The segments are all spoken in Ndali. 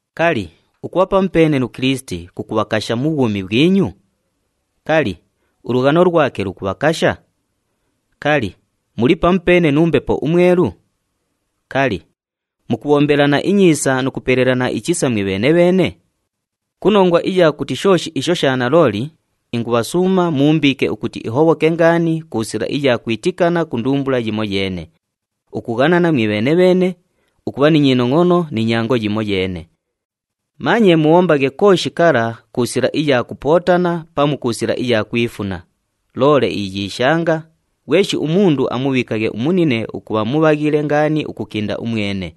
Kali, ukubha pamupeene nu Kilisiti kukubhakasha mu bhwumi bhwinyu? Kali, ulughano lwake lukubhakasha? Kali, muli pamupeene nu Mbepo uMwelu? Kali, mukubhombelana inyiisa nu kupelelana ichisa mwibheene-bheene? Ku nongwa iya kuti shooshi isho sha nalooli, ingubhasuuma muumbiike ukuti ihobhoke ngaani ku sila iya kwitikana ku ndumbula yimoyeene, ukughanana mwibheene-bheene, ukubha ni nyinongʼono ni nyango yimoyeene. Manye mubhombaghe kooshi kala ku sila iya kupootana pamu ku sila iya kwifuna, loole iyiishanga, ghweshi umundu amubhiikaghe umunine ukubha mubhaghile ngaani ukukinda umwene.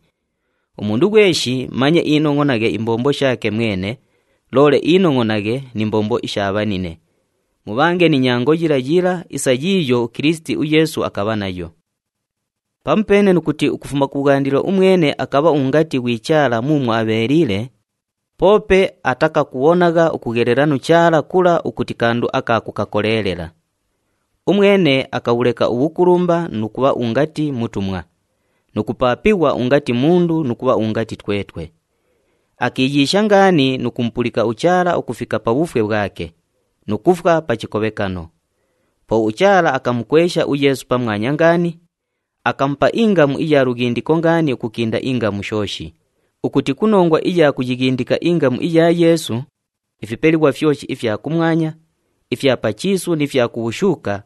Umundu ghweshi manye inongʼonaghe imbombo shaake mwene, loole inongʼonaghe ni mbombo isha bhanine. Mubhange ni nyango yila yila isa yiiyo uKilisiti uYeesu akabha nayo. Pamupeene nu kuti ukufuma kubhwandilo umwene akabha ungati ghwi Chaala muumwo abheeliile, poope atakakubhonagha ukughelela nu Chaala kula ukuti kandu aka kukakoleelela. Umwene akabhuleka ubhukulumba nu kubha ungati mutumwa, nu kupaapighwa ungati mundu nu kubha ungati twetwe. Akiiyiisha ngaani nu kumupulika uChaala ukufika pa bhufwe bhwake, nu kufwa pa chikobhekano. Po uChaala akamukwesha uYeesu pamwanya ngaani, akamupa ingamu iya lughindiko ngaani ukukinda ingamu shooshi ukuti ku nongwa iya kuyighindika ingamu iya Yeesu, ifipelighwa fyoshi ifya kumwanya, ifya pa chiisu ni fya ku bhushuuka,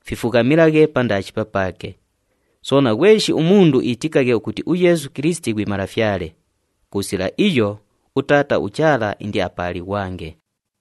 fifughamilaghe pandaashi papaake. Soona, ghweshi umundu iitikaghe ukuti uYeesu Kilisiti ghwi Malafyale, ku sila iyo, uTaata uChaala indiapaalighwange.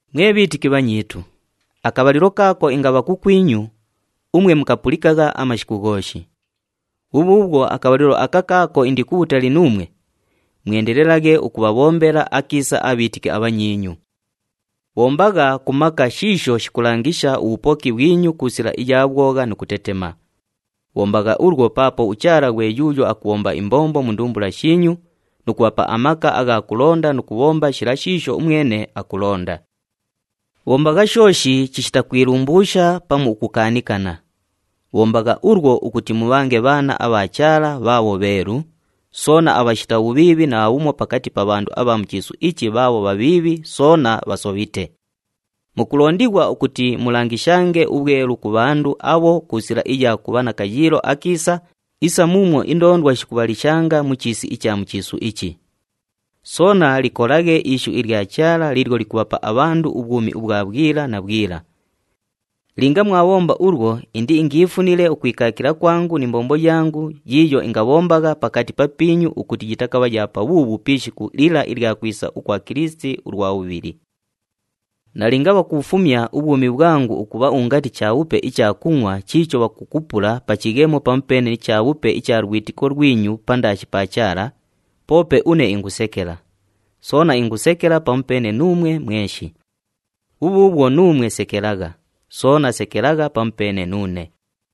Mwe bhiitiki bhanyiitu, akabhalilo kaako ingabha kukwinyu, umwe mukapulikagha amashiku ghooshi. Bhubhuubhwo akabhalilo aka kaako indi kubhutali nuumwe, mwendelelaghe ukubhabhombela akiisa abhiitiki abhanyiinyu. Bhombagha ku maka shiisho shikulangisha ubhupoki bhwinyu ku sila iya bhwogha nu kutetema. Bhombagha ulwo paapo uChaala ghwe yuuyo akubhomba imbombo mu ndumbula shiinyu nu kubhapa amaka agha kulonda nu kubhomba shila shiisho umwene akulonda. Bhombagha shooshi chishita kwilumbuusha pamu ukukaanikana. Bhombagha ulwo ukuti mubhange bhaana abha Chaala bhaabho bheelu, soona abhashita bhubhiibhi naabhumo pakati pa bhandu abha mu chiisu ichi bhaabho bhabhiibhi soona bhasobhite. Mukulondighwa ukuti mulangishange ubhwelu ku bhandu abho ku sila iya kubha na kayiilo akiisa isa muumwo indoondwa shikubhalishanga mu chiisi icha mu chiisu ichi. Soona likolaghe ishu ilya Chaala liilyo likubhapa abhandu ubhwumi ubhwa bhwila na bhwila. Linga mwabhomba ulwo, indiingiifunile ukwikaakila kwangu ni mbombo yangu yiiyo ingabhombagha pakati papiinyu ukuti yitakabha ya pabhuubhu pi ishiku lila ilya kwisa ukwa Kilisiti ulwa bhubhili. Nalinga bhakubhufumya ubhwumi bhwangu ukubha ungati chabhupe icha kungʼwa chiicho bhakukupula pa chighemo pamupeene ni chabhupe icha lwitiko lwinyu pandaashi pa Chaala, poope une ingusekela, soona ingusekela pamupeene nuumwe mweshi. Bhubhuubhwo nuumwe sekelagha, soona sekelagha pamupeene nuune.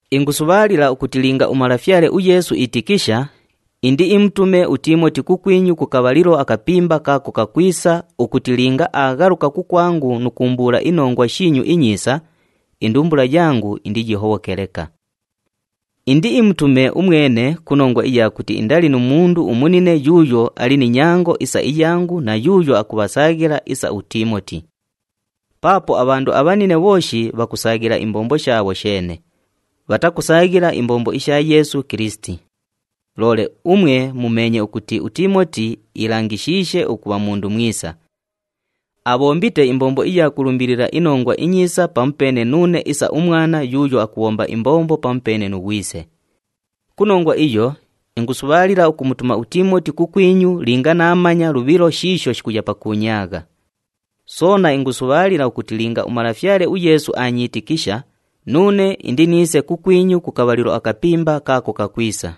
Ingusubhaalila ukuti linga uMalafyale uYeesu iitikisha, indiimutume uTiimoti kukwinyu ku kabhalilo akapimba kaako kakwisa ukuti linga aaghaluka kukwangu nu kuumbuula inongwa shiinyu inyiisa, indumbula yangu indiyihobhoke leka. Indiimutume umwene ku nongwa iya kuti indali nu mundu umunine yuuyo ali ni nyango isa iyangu na yuuyo akubhasaaghila isa uTiimoti. Paapo abhandu abhanine bhooshi bhakusaaghila imbombo shaabho sheene, bhatakusaaghila imbombo isha Yeesu Kilisiti. Loole umwe mumeenye ukuti uTiimoti iilangishiishe ukubha mundu mwisa. Abhombite imbombo iya kulumbilila iNongwa iNyiisa pamupeene nuune isa umwana yuuyo akubhomba imbombo pamupeene nu ghwise. Ku nongwa iyo, ingusubhaalila ukumutuma uTiimoti kukwinyu linga naamanya lubhilo shiisho shikuya pakuunyaagha. Soona ingusubhaalila ukuti linga uMalafyale uYeesu aanyiitikisha, nuune indiniise kukwinyu ku kabhalilo akapimba kaako kakwisa.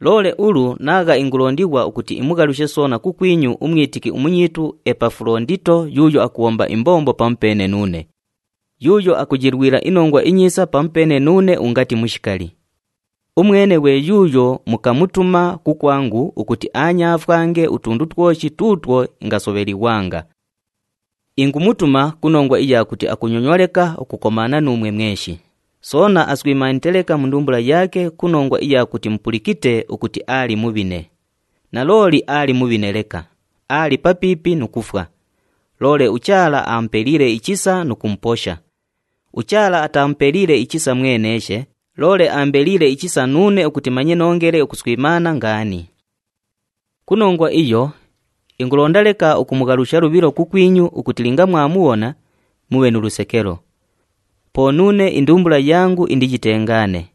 Loole ulu naagha ingulondighwa ukuti imughalushe soona kukwinyu umwitiki umunyiitu uEpafulondito yuuyo akubhomba imbombo pamupeene nuune, yuuyo akuyilwila iNongwa iNyiisa pamupeene nuune ungati mushikali. Umwene ghwe yuuyo mukamutuma kukwangu ukuti aanyaafwange utundu twoshi tuutwo ingasobhelighwanga. Ingumutuma ku nongwa iya kuti akunyonywa leka ukukomaana nuumwe mweshi, soona aswimaanite leka mu ndumbula yaake ku nongwa iya kuti mupulikite ukuti aali mubhine. Nalooli aali mubhine leka, aali papiipi nu kufwa. Loole uChaala amupeliile ichisa nu kumuposha. UChaala atamupeliile ichisa mweneeshe, loole aambeliile ichisa nuune ukuti manye noongele ukuswimaana ngaani. Ku nongwa iyo, ingulonda leka ukumughalusha lubhilo kukwinyu ukuti linga mwamubhona, mubhe nu lusekelo. Po nuune indumbula yangu indiyitengaane.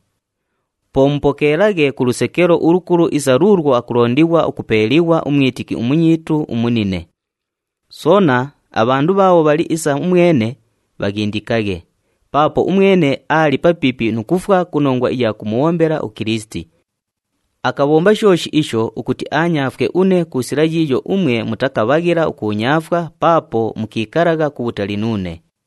Po mupokeelaghe ku lusekelo ulukulu isa luulwo akulondighwa ukupeeliighwa umwitiki umunyiitu umunine. Soona, abhandu bhaabho bhali isa umwene, bhaghindikaghe paapo umwene aali papiipi nu kufwa ku nongwa iya kumubhombela uKilisiti. Akabhomba shooshi isho ukuti aanyaafwe une ku sila yiiyo umwe mutakabhaghila ukuunyaafwa paapo mukiikalagha kubhutali nuune.